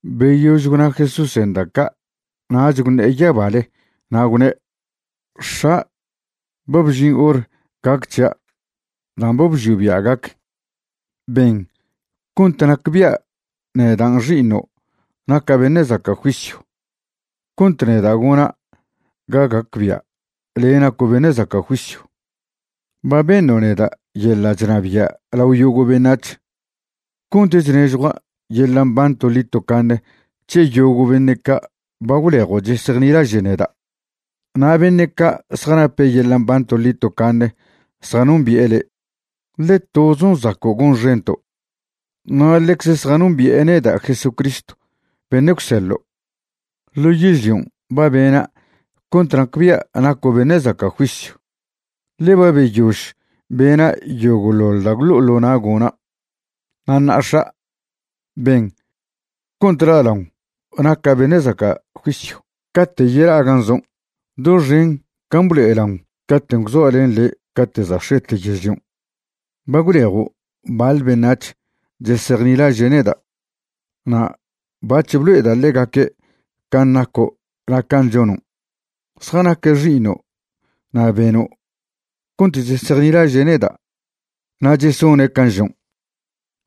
Beyož gwna Jesúsen' da' ca' nach gwṉe'e yabale na' gwne': ―X̱a', ba bžin hor gac c̱hia' dan' ba bžio' bia' gac. Ben cont nacbia' nedan' Xi'iṉo' naca' beṉe' zaca' juisyw cont neda' gona' ga gacbia' le' naco' beṉe' zaca' juisyw. Ba beṉo' neda' yeḻa' chnabia' lao yogo' beṉac̱h cont chnežjua' yeḻa' mban toḻi tocaṉe c̱he yogo' beṉe' ca' ba gwlejo' chesejnilaže' neda'. Na' beṉe' ca' zjanape' yeḻa' mban toḻi tocaṉe zjanombi'e le', ḻe tozon' zaco' gonxento', na' ḻecze zjanombi'e neda' Jesucristw beṉe' gwseḻo'. ’Ḻo yežlion' ba bena' cont nacbia' naco' beṉe' zaca' juisyw, ḻe ba beyož bena' yogo'ḻoḻ da' gwlo'o ḻo na' gona'. Na' ṉa'a X̱a', ben cont la'laon naca' beṉe' zaca' juisyw cate' yela'a gan' zon', doxen can' blo'elaon cate' gwzoa' len le' cate' za' x̱ete yežlion'. ’Ba gwlejo' baḻ beṉac̱h chesejnilaže' neda', na' bac̱h blo'eda' ḻegaque' can' naco' na' can' chonon'. Zjanaque' xi'iṉo' na' beno' cont chesejnilaže' neda' na' chesone' can' žon'.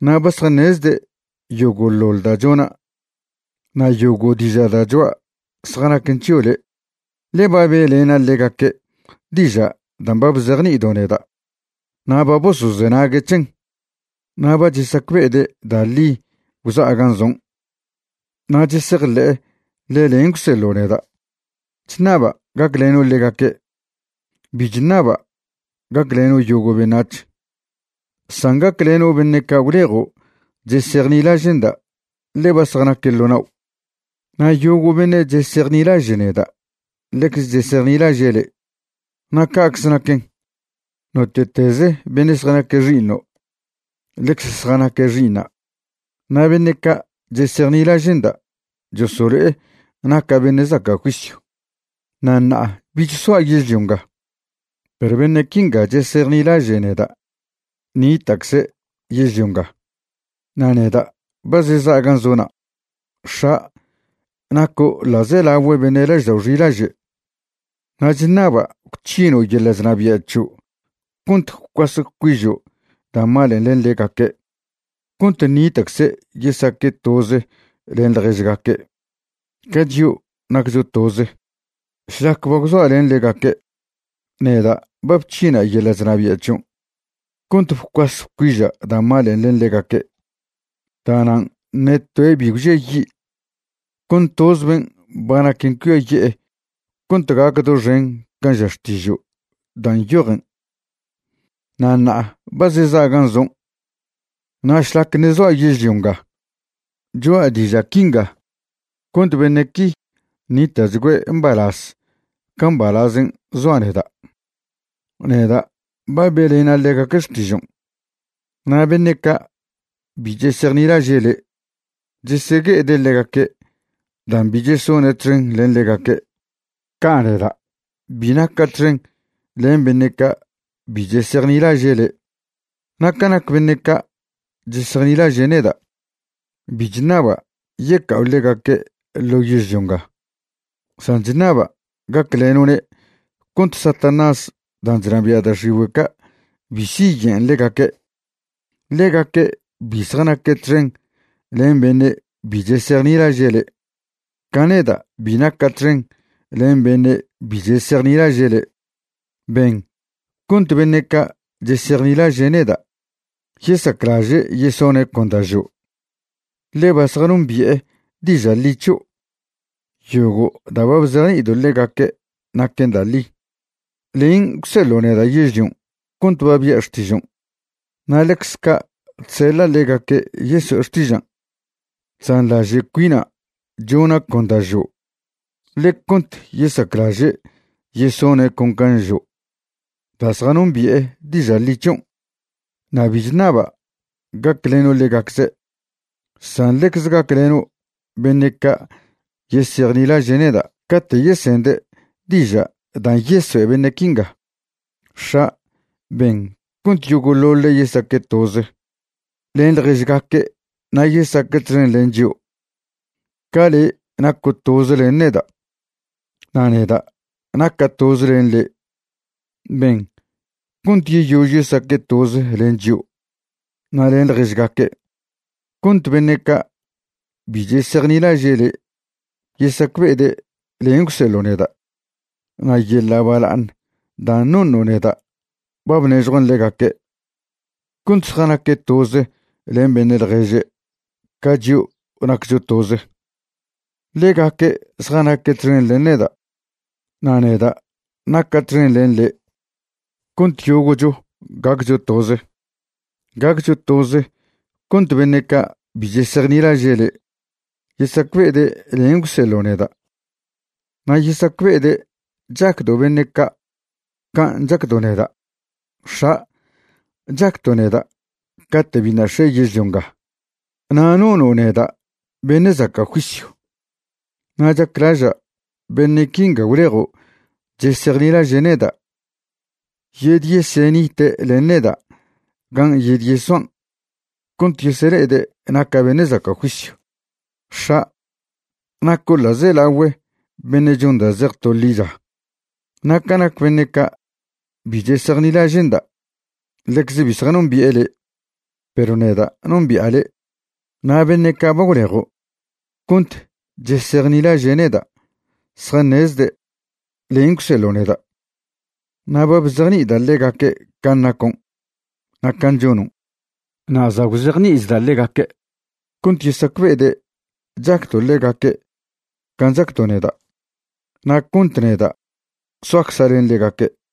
Na' ba zjaṉezde' yogoḻoḻ da' chona' na' yogo' diža' da' choa' zjanaquen c̱hio' le'. Ḻe ba be'lena' ḻegaque' diža' dan' ba bzejni'ido' neda' na' ba bosozenague' c̱hen, na' ba chesacbe'ede' da' ḻi gwza'a gan' zon', na' chesejḻe'e ḻe len' gwseḻo' neda'. ’Chṉaba' gacleno' ḻegaque'. Bi chṉaba' gacleno' yogo' beṉac̱h, san gacleno' beṉe' ca' gwlejo' chesejnilaže'nda' ḻe ba zjanaque' ḻo nao'. Na' yogo' beṉe' chesejnilaže' neda' ḻecze chesejnilaže' le'. Na' ca'cze naquen, note'tez beṉe' zjanaque' xi'iṉo' ḻecz zjanaque' xi'iṉa', na' beṉe' ca' chesejnilaže'nda' chosolo'e naca' beṉe' zaca' juisyw. ’Na' ṉa'a bich soa' yežlio nga, perw beṉe' quinga chesejnilaže' neda' ṉita'cze' yežlio nga, na' neda' ba zeza' gan' zo'na'. X̱a', naco' ḻa'zelagüe beṉe' laždao' xilaže', na' chṉaba' gwc̱hino' yeḻa' chnabia' c̱hio' cont gwcuas gwcuižo' da' malen' len ḻegaque' cont ṉita'cze' yesaque' toze len ḻježgaque', ca chio' naccho toze. Šlac ba gwzoa len ḻegaque', neda' ba bc̱hina' yeḻa' chnabia' c̱hion' cont bcuas bcuiža' da' malen' len ḻegaque'. Da'nan' ṉe toe' bi gwžiayi', con toz ben' ba naquen cuiaye'e cont gac doxen can' ža Xtižo' dan' nyojen. ’Na' ṉa'a ba zeza' gan' zon', na' šlac ṉe' zoa' yežlio nga cho'a diža' quinga cont beṉe' qui ṉita'chgüe' mbalaz ca mbalazen' zoa' neda'. Neda' ba be'lena' ḻegaque' xtižon', na' beṉe' ca' bi chesejnilaže' le' chesegue'ede' ḻegaque' dan' bi chesone' txen len ḻegaque', ca' neda' bi naca' txen len beṉe' ca' bi chesejnilaže' le'. Na' ca nac beṉe' ca' chesejnilaže' neda', bi chṉaba' yeca'o ḻegaque' ḻo' yežlio nga, san chṉaba' gacleno'ne' cont Satanás dan' chnabia' da' x̱igüe' ca' bi siye'en ḻegaque'. Ḻegaque' bi zjanaque' txen len beṉe' bi chesejnilaže' le', ca neda' bi naca' txen len beṉe' bi chesejnilaže' le'. Ben cont beṉe' ca' chesejnilaže' neda' yesaclaže' yesone' con da' žo', ḻe ba zjanombi'e diža' ḻi c̱hio'. Yogo' da' ba bzejni'ido' ḻegaque' naquen da' ḻi. Len' gwseḻo' neda' yežlion' cont ba bia' xtižon', na' ḻecze ca' chseḻa' ḻegaque' yeso'e xtižan'. Chzanḻaže' cuina' chona' con da' žo' le' cont yesaclaže' yesone' con can' žo' da' zjanombi'e diža' ḻi c̱hion'. ’Na' bi chṉaba' gacleno' ḻegacze', san ḻecze gacleno' beṉe' ca' yesejnilaže' neda' cate' yesende' diža' dan' yesoe' beṉe' quinga. X̱a', ben cont yogo'ḻoḻe' yesaque' toze len ḻježgaque' na' yesaque' txen len chio', ca le' naco' toze len neda' na' neda' naca' toze len le'. Ben cont yeyož yesaque' toze len chio' na' len ḻježgaque' cont beṉe' ca' bi chesejnilaže' le' yesacbe'ede' len' gwseḻo' neda'. Na' yeḻa' bala'aṉ dan' noṉo' neda' ba bnežjuan' ḻegaque' cont zjanaque' toze len beṉe' ḻježe' ca chio' naccho toze. Ḻegaque' zjanaque' txen len neda' na' neda' naca' txen len le' cont yogo'cho gaccho toze. Gaccho toze cont beṉe' ca' bi chesejnilaže' le' yesacbe'ede' len' gwseḻo' neda' na' yesacbe'ede' chacdo' beṉe' ca' can' chacdo' neda'. ’X̱a', chacdo' neda' cate' biṉa' x̱e yežlio nga na' nono' neda' beṉe' zaca' juisyw. Na' chaclaža' beṉe' quinga gwlejo' chesejnilaže' neda' yedyesenite' len neda' gan' yedyesoan' cont yesele'ede' naca' beṉe' zaca' juisyw. X̱a', naco' ḻa'zelagüe beṉe' chon da' zej to ḻicha. Na' ca nac beṉe' ca' bi chesejnilaže'nda', ḻecze bi zjanombi'e le', perw neda' nombi'a le', na' beṉe' ca' ba gwlejo' cont chesejnilaže' neda' zjaṉezde' len' gwseḻo' neda'. Na' ba bzejni'ida' ḻegaque' can' nacon' na' can' chonon', na' za' gwzejni'ichda' ḻegaque', cont yesacbe'ede' chacdo' ḻegaque' can' chacdo' neda', na' cont neda' soacza' len ḻegaque'.